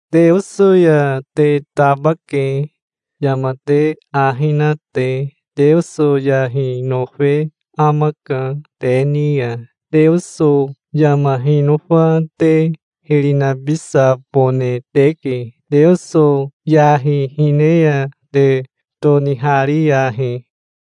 Teoso ya te tabake, yama te ahi na te. Teoso yahi nofe amaka te ni ya. Teoso yama hinofa te hiri nabisabone teke. Teoso yahi hine ya te tonihariyahi.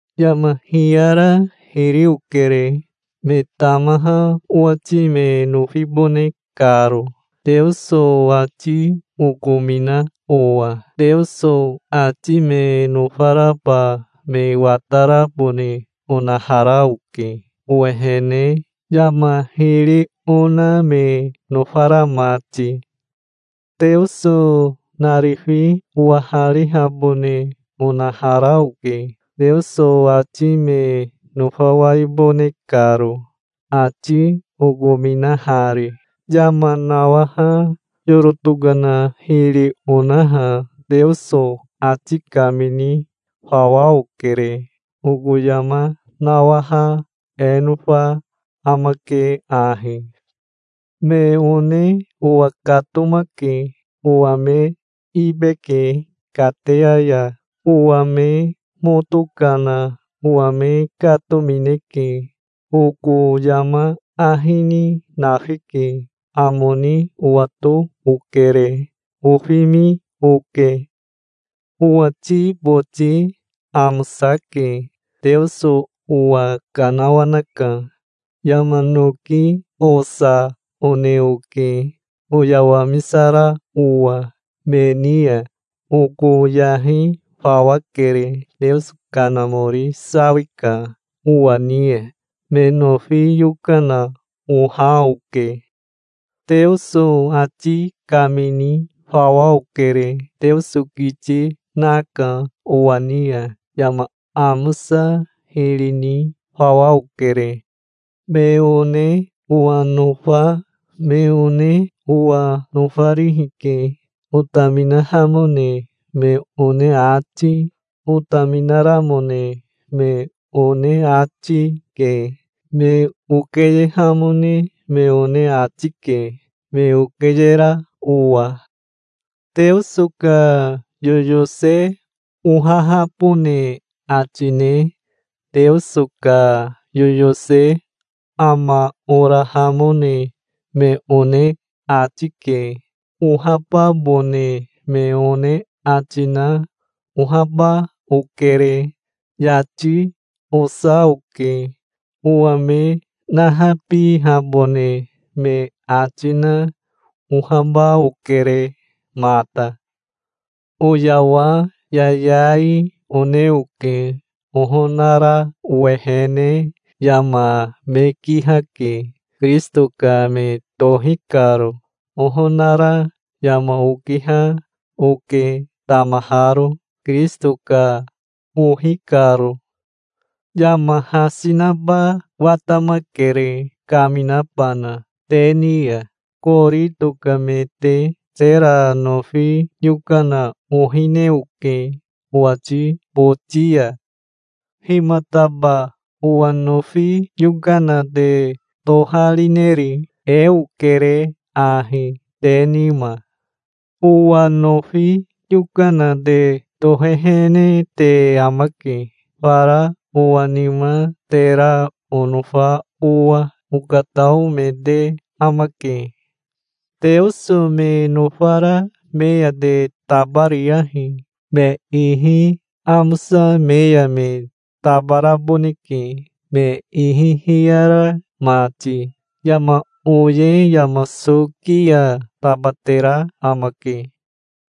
Yama hiyara hiri okere, me tamaha owati me nofibone karo, Teoso ati okomina owa. Teoso ati me nofaraba me watarabone onahara oke owehene, yama hiri ona me nofara mati. Teoso narifi owaharihabone onahara oke, Teoso ati me nofawaibone karo, ati okominahari. Yama nawaha yoro tokana hiri onaha Teoso ati kamini fawa okere. Oko yama nawaha e nofa amake ahi: Me one owa katomake. Owa me ibe, ke kateya ya. Owa me moto kana owa me katomineke. Oko yama ahi ni nafike. Amo ni owato okere. Ofimi, oke. Owati boti amosake. Teoso owa kanawanaka. Yama noki osa one oke oyawamisara owa. Me ni ya oko yahi fawa kere. Teoso Kanamori sawika owa ni ya. Me nofi yokana oha oke. Teoso ati kamini fawa okere. Teoso kiti naka owa ni ya. Yama amosa hiri ni fawa okere. Me one owa nofa me one owa nofarihi ke. Otaminahamone me one ati, otaminaramone me one ati, ke. Me okeyehamone me one ati ke, me okeyera owa. Teoso ka yoyose ohahabone ati ne Teoso ka yoyose ama orahamone me one ati ke. Ohababone me one ati na ohaba okere. Yati osa oke. Owa me nahabihabone me ati na ohaba okere mata. Oyawa yayai, one oke. Ohonara owehene yama me kihake, Kirisito ka me tohi karo. Ohonara yama okiha, oke tamaharo, Kirisito ka ohi karo. Yama hasi naba watamakere, kaminabana te ni ya, Korito ka me te. Tera nofi yokana ohine oke owati boti ya. Himataba owa nofi yokana te toharineri? E okere ahi te nima. Owa nofi yokana te tohehene te amake, fara owa nima, tera onofa owa. Okatao me te amake. Teoso me nofara me ya te tabariyahi. Me ihi amosa me ya me tabaraboneke, me ihi hiyara mati. Yama oye yama soki ya tabatera amake.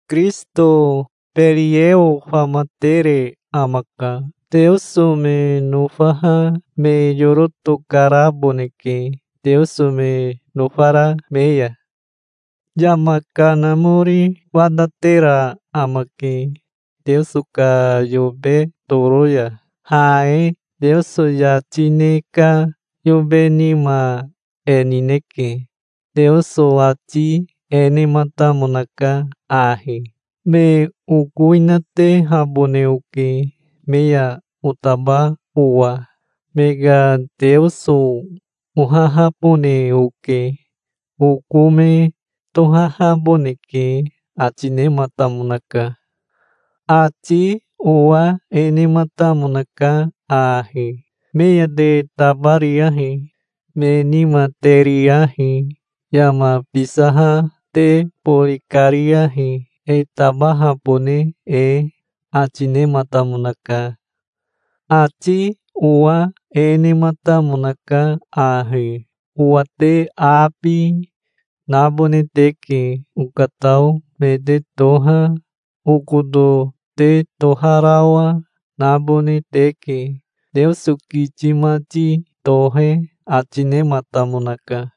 Kirisito Berieo famatere amaka. Teoso me nofaha me yoro tokaraboneke Teoso me nofara me ya. Yama kanamori watatera amake Teoso ka yobe toro ya. Ha e Teoso yati ne ka yobe nima e nineke. Teoso ati e nematamonaka ahi: "Me okowinatehabone oke, me ya otaba owa. Me ka Teoso ohahabone oke. Oko me tohahaboneke", ati nematamonaka. Ati owa e nematamonaka ahi: "Me ya te tabariyahi. Me nima te riyahi. Yama bisaha te bori kariyahi, e tabahabone e", ati nematamonaka. Ati owa e nematamonaka ahi: "Owa te abi nabone teke. Okatao me te toha, okoto te toharawa, nabone teke, Teoso kiti mati tohe ati nematamonaka".